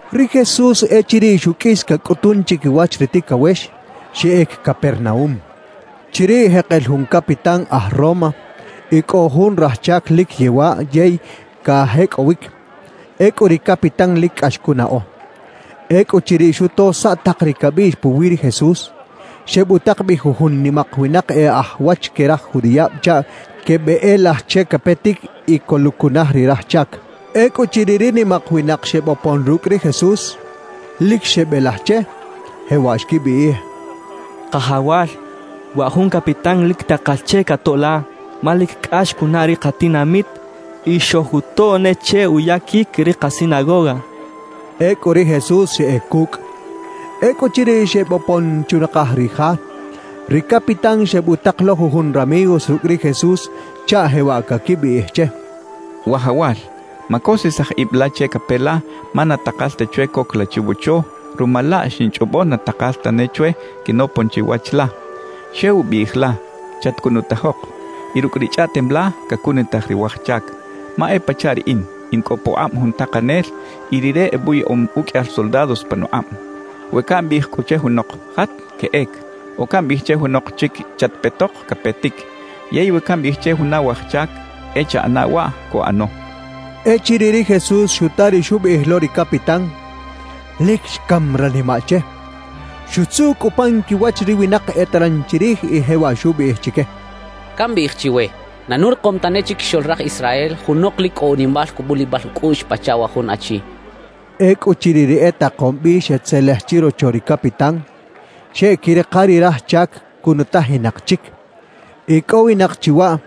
Ri Jesús echiriꞌ xuqꞌuis cacꞌutun chiquiwach ri ticawex, xeꞌec Capernaúm. Chiriꞌ jekel jun capitán aj Roma y cꞌo jun raj chac lic yewaꞌ yey cajecꞌowic. Ecꞌu ri capitán lic cꞌax cunaꞌo. Ecꞌuchiriꞌ xuto saꞌ tak ri cabiꞌx puwi ri Jesús, xebutak bi jujun nimak winak e aj wach que raj judiꞌab chaꞌ quebeꞌelaj che capetic y coluꞌcunaj ri raj chac. Ecꞌuchiriꞌ ri nimak winak xebopon rucꞌ ri Jesús, lic xebelaj che, jewaꞌ xquibiꞌij: —Kajawal, wa jun capitán lic takal che catoꞌ la, ma lic cꞌax cunaꞌ ri katinamit y xojutoꞌ ne che uyaquic ri kasinagoga —xechaꞌ. Ecꞌu ri Jesús xeꞌec cucꞌ. Ecꞌuchiriꞌ xebopon chunakaj ri ja, ri capitán xebutak lo jujun ramigos rucꞌ ri Jesús chaꞌ jewaꞌ caquibiꞌij che: «Wajawal, macosisaj ib la che cape la, ma na takal ta chwe coc la chiwocho; ruma laꞌ xinchꞌobo na takal tane chwe quinopon chiwach la. Xew biꞌij la: “Chatcunutajok”, y rucꞌ ri chꞌaꞌtem la, cacunutaj ri waj chac. Ma e pachaꞌ riꞌin, in cꞌo pukꞌab jun takanel y rire ebuyaꞌom uqꞌuiyal soldados panukꞌab. We cambiꞌij cꞌu che junok: “Jat”, queꞌec; o cambiꞌij che junok chic: “Chatpetok”, capetic. Yey we cambiꞌij che juna waj chac: “E chaꞌana waꞌ”, cuꞌano.» Echiriꞌ ri Jesús xuta ri xubiꞌij lo ri capitán, lic xcam ranimaꞌ che. Xutzuꞌ cꞌu pan quiwach ri winak eteran chirij y jewaꞌ xubiꞌij chique: —Cambiꞌij chiwe, na nurikom tane chiquixoꞌl raj Israel junok lic cꞌo unimal cubulibal ucꞌuꞌx pachaꞌ wa jun achi —xchaꞌ. Ecꞌuchiriꞌ ri etakom bi xetzelej chirocho ri capitán, xeꞌquirika ri raj chac cunutajinak chic. Icꞌowinak chi waꞌ,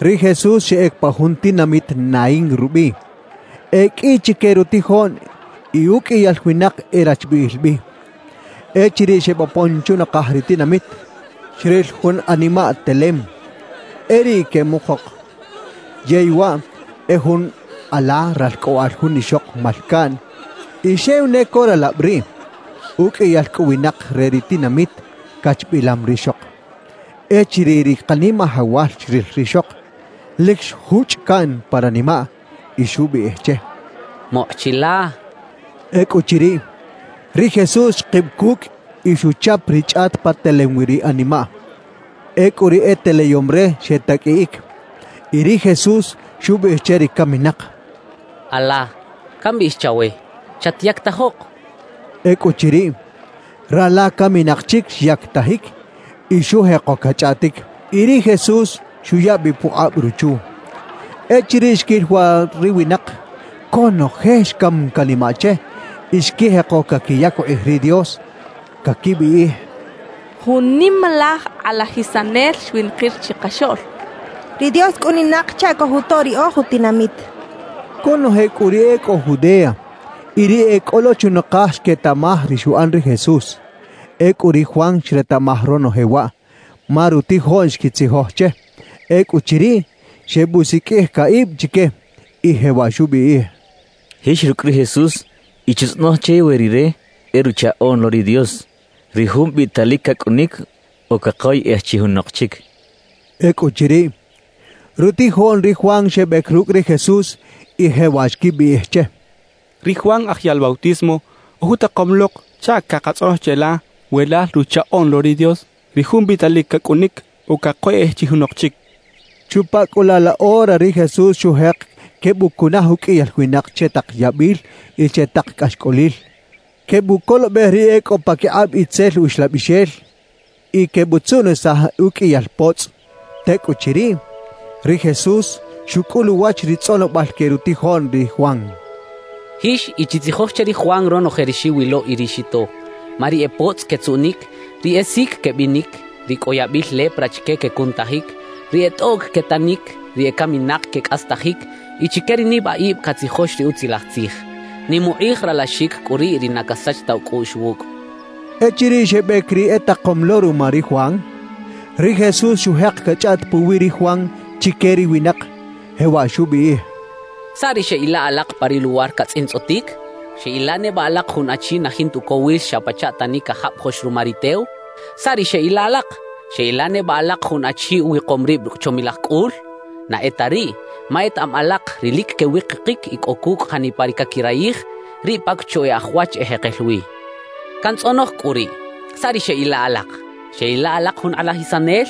ri Jesús xeꞌec pa jun tinamit Naín rubiꞌ. E qꞌui chique rutijoꞌn y uqꞌuiyal winak e rachbiꞌil bi. Echiriꞌ xebopon chunakaj ri tinamit, xril jun animaꞌ telem, e riꞌ queꞌmukok. Yey waꞌ e jun ala ralcꞌoꞌal jun ixok malcaꞌn y xew ne co ralab riꞌ. Uqꞌuiyal cꞌu winak re ri tinamit cachbilam rixok. Echiriꞌ ri Kanimajawal xril rixok, lic xjuchꞌ caꞌn pa ranimaꞌ y xubiꞌij che: —Mokꞌ chi la —xchaꞌ. Ecꞌuchiriꞌ, ri Jesús xkib cucꞌ y xuchap ri chꞌat pa telem wi ri animaꞌ. Ecꞌu ri e teleyom re xetaqꞌuiꞌic. Y ri Jesús xubiꞌij che ri caminak: —Ala, cambiꞌij chawe: ¡Chatyactajok! —xchaꞌ. Ecꞌuchiriꞌ, rala caminak chic xyactajic y xujeko cachꞌaꞌtic. Y ri Jesús xuya bi pukꞌab ruchu. Echiriꞌ xquil waꞌ ri winak, conoje xcam canimaꞌ che y xquijeko caquiyac ukꞌij ri Dios, caquibiꞌij: —Jun nimalaj kꞌalajisanel xwinakir chikaxoꞌl. Ri Dios cꞌuninak chaꞌ cojutoꞌ ri oj utinamit —xechaꞌ. Conoje cꞌu ri e cꞌo Judea y ri e cꞌo lo chunakaj xquetaꞌmaj ri xuꞌan ri Jesús. Ecꞌu ri Juan xretaꞌmaj ronoje waꞌ, ma rutijoꞌn xquitzijoj che. Ecꞌuchiriꞌ, xebusiqꞌuij caꞌib chique y jewaꞌ xubiꞌij: —Jix rucꞌ ri Jesús y chitzꞌonoj che we Rire e Ruchaꞌoꞌn lo ri Dios, ri Jun biꞌtalic cacꞌunic, o cakoyꞌej chi junok chic —xchaꞌ. Ecꞌuchiriꞌ, rutijoꞌn ri Juan xebec rucꞌ ri Jesús y jewaꞌ xquibiꞌij che: —Ri Juan Aj Yaꞌl Bautismo ojutakom lok chaꞌ cakatzꞌonoj cheꞌla we lal Ruchaꞌoꞌn lo ri Dios, ri Jun biꞌtalic cacꞌunic o cakoyꞌej chi junok chic —xecha che. Chupa cꞌu laꞌ la ora ri Jesús xujek quebucunaj uqꞌuiyal winak che tak yabil y che tak cꞌaxcꞌolil, quebucolobej ri e cꞌo paquikꞌab itzel uxlabixel y quebutzuꞌnisaj uqꞌuiyal potzꞌ. Tecꞌuchiriꞌ, ri Jesús xucꞌul uwach ri tzꞌonobal que rutijoꞌn ri Juan: —Jix y chitzijoj che ri Juan ronoje ri xiwilo y ri xito. Ma ri e potzꞌ quetzuꞌnic, ri e sic quebinic, ri cꞌo yabil lepra chique quecunutajic, ri e tꞌoꞌc quetanic, ri ecaminak quecꞌastajic y chique ri nibaꞌib catzijox ri Utzilaj Tzij. Nim ukꞌij ralaxic cꞌu riꞌ ri na casach ta ucꞌuꞌx wucꞌ —xchaꞌ. Echiriꞌ xebec ri etakom lo ruma ri Juan, ri Jesús xujek cachꞌaꞌt puwi ri Juan chique ri winak, jewaꞌ xubiꞌij: «¿Saꞌ ri xeꞌila alak pa ri luwar catzꞌintzꞌotic? ¿Xeꞌila neba alak jun achi na jinta ucowil xa pachaꞌ tani cajabajoꞌx ruma ri tew? ¿Saꞌ ri xeꞌila alak? ¿Xeꞌila neba alak jun achi uwikom rib rucꞌ chomilaj cꞌul? Na e ta riꞌ, ma etaꞌam alak ri lic quewikikic y cꞌo cucꞌ janipa ri caquirayij, riꞌ pa cocho e aj wach ejekel wi. Cantzꞌonoj cꞌu riꞌ: ¿Saꞌ ri xeꞌila alak? ¿Xeꞌila alak jun kꞌalajisanel?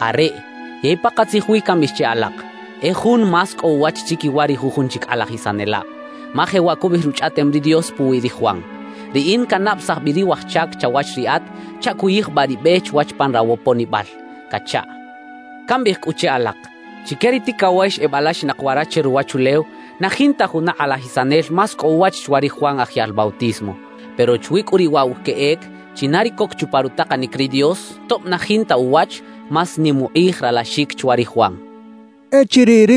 Areꞌ, yey pakatzij wi cambiꞌij che alak: E jun más cꞌo uwach chiquiwa ri jujun chic kꞌalajisanelab. Ma jewaꞌ cubiꞌij Ruchꞌaꞌtem ri Dios puwi ri Juan: Riꞌin cannabesaj bi ri waj chac chawach Riꞌat chaꞌ cuyijbaꞌ ri be chwach pan rawoponibal cachaꞌ. Cambiꞌij cꞌu che alak: Chique ri ticawex ebalaxinak wara che ruwachulew, na jinta juna kꞌalajisanel más cꞌo uwach chwa ri Juan Aj Yaꞌl Bautismo. Pero chwi cꞌu riꞌ waꞌ wa queꞌec, china ri coc chupa rutakanic ri Dios, tob na jinta uwach, más nim ukꞌij ralaxic chwa ri Juan» xcha ri Jesús.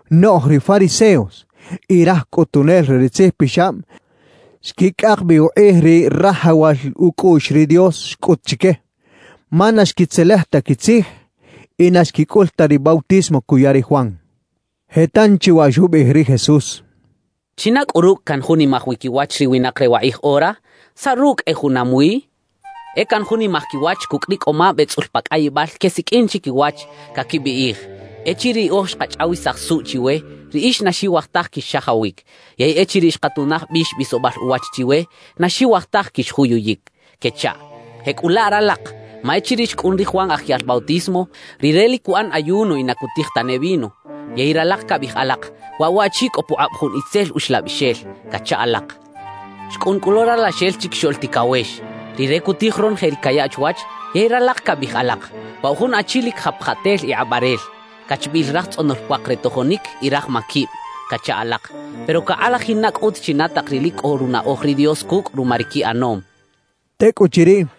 Noꞌj ri fariseos y raj cꞌutunel re ri tzijpixab xquicꞌak bi ukꞌij ri rajawal ucꞌuꞌx ri Dios xcꞌut chique, ma na xquitzelej ta quitzij y na xquicꞌul ta ri bautismo cuya ri Juan. Je tanchi waꞌ xubiꞌij ri Jesús: «¿China cꞌu rucꞌ canjunimaj wi quiwach ri winak re wakꞌij ora? ¿Saꞌ rucꞌ e junam wi? E canjunimaj quiwach cucꞌ ri cꞌoꞌmab etzꞌul pa cꞌayibal quesiqꞌuin chiquiwach, caquibiꞌij: “Echiriꞌ riꞌoj xkachꞌawisaj suꞌ chiwe, riꞌix na xiwaj taj quix-xajawic; yey echiriꞌ xkatunaj bix bisobal uwach chiwe, na xiwaj taj quixjuyuyic” —quechaꞌ. Jecꞌulaꞌ ralak, ma echiriꞌ xcꞌun ri Juan Aj Yaꞌl Bautismo, rire lic cuꞌan ayuno y na cutij tane vino. Yey ralak cabiꞌij alak: “Waꞌ waꞌchi cꞌo pukꞌab jun itzel uxlabixel” cacha alak. Xcꞌun cꞌu lo Ralaxel Chiquixoꞌl Ticawex. Rire cutij ronoje ri cayaꞌ chwach, yey ralak cabiꞌij alak: “Waꞌ wa jun achi lic japjatel y kꞌabaꞌrel, cachbiꞌil raj tzꞌonol puak re tojonic y raj maquib” cacha alak. Pero cakꞌalajin na cꞌut china tak ri lic cꞌo runaꞌoj ri Dios cucꞌ ruma ri quiꞌanom» xcha ri Jesús.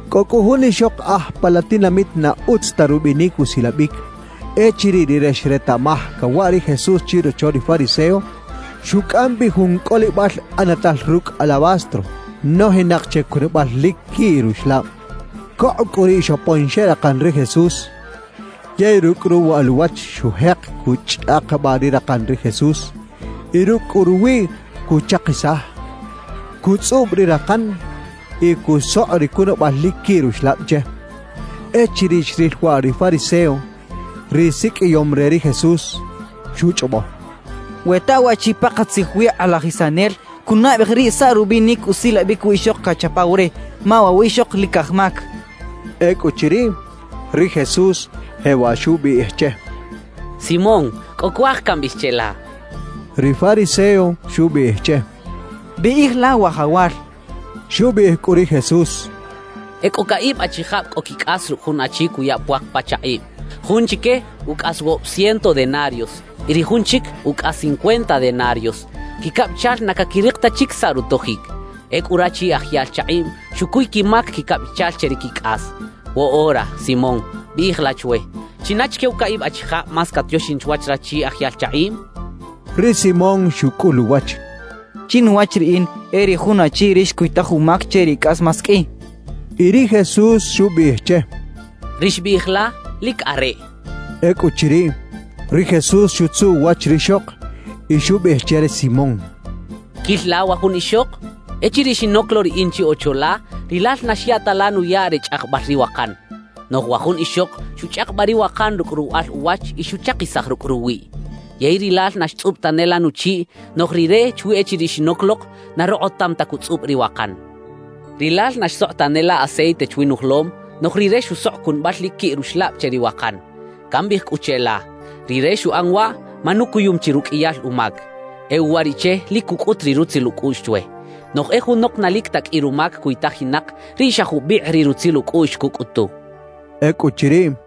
Cꞌo cꞌu jun ixok aj pa la tinamit na utz ta rubinic usilabic. Echiriꞌ rire xretaꞌmaj cawaꞌ ri Jesús chirocho ri fariseo, xucꞌam bi jun cꞌolibal ꞌanatal rucꞌ alabastro nojinak che cunabal lic quiꞌ ruxlab. Cokꞌ cꞌu riꞌ xopon xeꞌrakan ri Jesús. Yey rucꞌ ruwaꞌal uwach xujek cuchꞌakabaꞌ ri rakan ri Jesús, y rucꞌ cꞌu ruwiꞌ cuchakisaj; cutzꞌub ri rakan y cusokꞌ ri cunabal lic quiꞌ ruxlab che. Echiriꞌ xril waꞌ ri fariseo, ri siqꞌuiyom re ri Jesús, xuchꞌobo: «We ta waꞌchi pakatzij wi kꞌalajisanel, cunaꞌbej riꞌ saꞌ rubinic usilabic wiꞌxok cachapaw re, ma waꞌ wiꞌxok lic aj mac.» Ecꞌuchiriꞌ, ri Jesús jewaꞌ xubiꞌij che: —Simón, cꞌo cuaj cambiꞌij cheꞌla —xchaꞌ. Ri fariseo xubiꞌij che: —Biꞌij la, Wajawal —xchaꞌ. Xubiꞌij cꞌu ri Jesús: —Ecꞌo caꞌib achijab cꞌo quicꞌas rucꞌ jun achi cuya puak pa chakꞌiꞌm. Jun chique, ucꞌas woꞌob ciento denarios y ri jun chic, ucꞌas cincuenta denarios. Quicabichal na caquirik ta chic saꞌ rutojic. Ecꞌu rachi aj yaꞌl chakꞌiꞌm xucuy quimac quicabichal che ri quicꞌas. Woꞌora, Simón, biꞌij la chwe ¿china chique wa caꞌib achijab más catioxin chwach rachi aj yaꞌl chakꞌiꞌm? —xchaꞌ. Ri Simón xucꞌul uwach: —Chinuwach riꞌin, e ri jun achi ri xcuytaj umac che ri cꞌas más qꞌui —xchaꞌ. Y ri Jesús xubiꞌij che: —Ri xbiꞌij la, lic areꞌ —xchaꞌ. Ecꞌuchiriꞌ, ri Jesús xutzuꞌ uwach rixok y xubiꞌij che ri Simón: —¿Quil la wa jun ixok? Echiriꞌ xinoc lo riꞌin chi ocho la, rilal na xya ta la nuyaꞌ re chꞌajbal ri wakan. Noꞌj wa jun ixok xuchꞌakabaꞌ ri wakan rucꞌ ruwaꞌal uwach y xuchakisaj rucꞌ ruwiꞌ. Yey rilal na xtzꞌub tane la nuchiꞌ; noꞌj rire chwi echiriꞌ xinoc lok, na rokꞌotam ta cutzꞌub ri wakan. Rilal na xsokꞌ tane la aceite chwi nujolom; noꞌj rire xusokꞌ cunabal lic quiꞌ ruxlab che ri wakan. Cambiꞌij cꞌu cheꞌla: Rire xuꞌan waꞌ ma nucuyum chi ruqꞌuiyal umac; e uwariꞌche lic cucꞌut ri rutzil ucꞌuꞌx chwe. Noꞌj e junok na lic ta qꞌui rumac cuytajinak, riꞌ xa jubikꞌ ri rutzil ucꞌuꞌx cucꞌutu —xcha che ri Simón.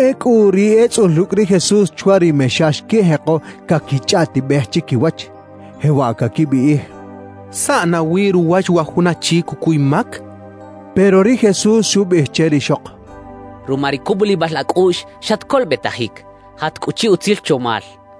Ecꞌu ri etzꞌul rucꞌ ri Jesús chwa ri mexa xquijeko caquichꞌaꞌtibej chiquiwach, jewaꞌ caquibiꞌij: «¿Saꞌ nawi ruwach wa jun achi cucuy mac?» quechaꞌ. Pero ri Jesús xubiꞌij che rixok: —Ruma ri cubulibal acꞌuꞌx, xatcolobetajic; jat cꞌu chi utzil chomal —xcha che.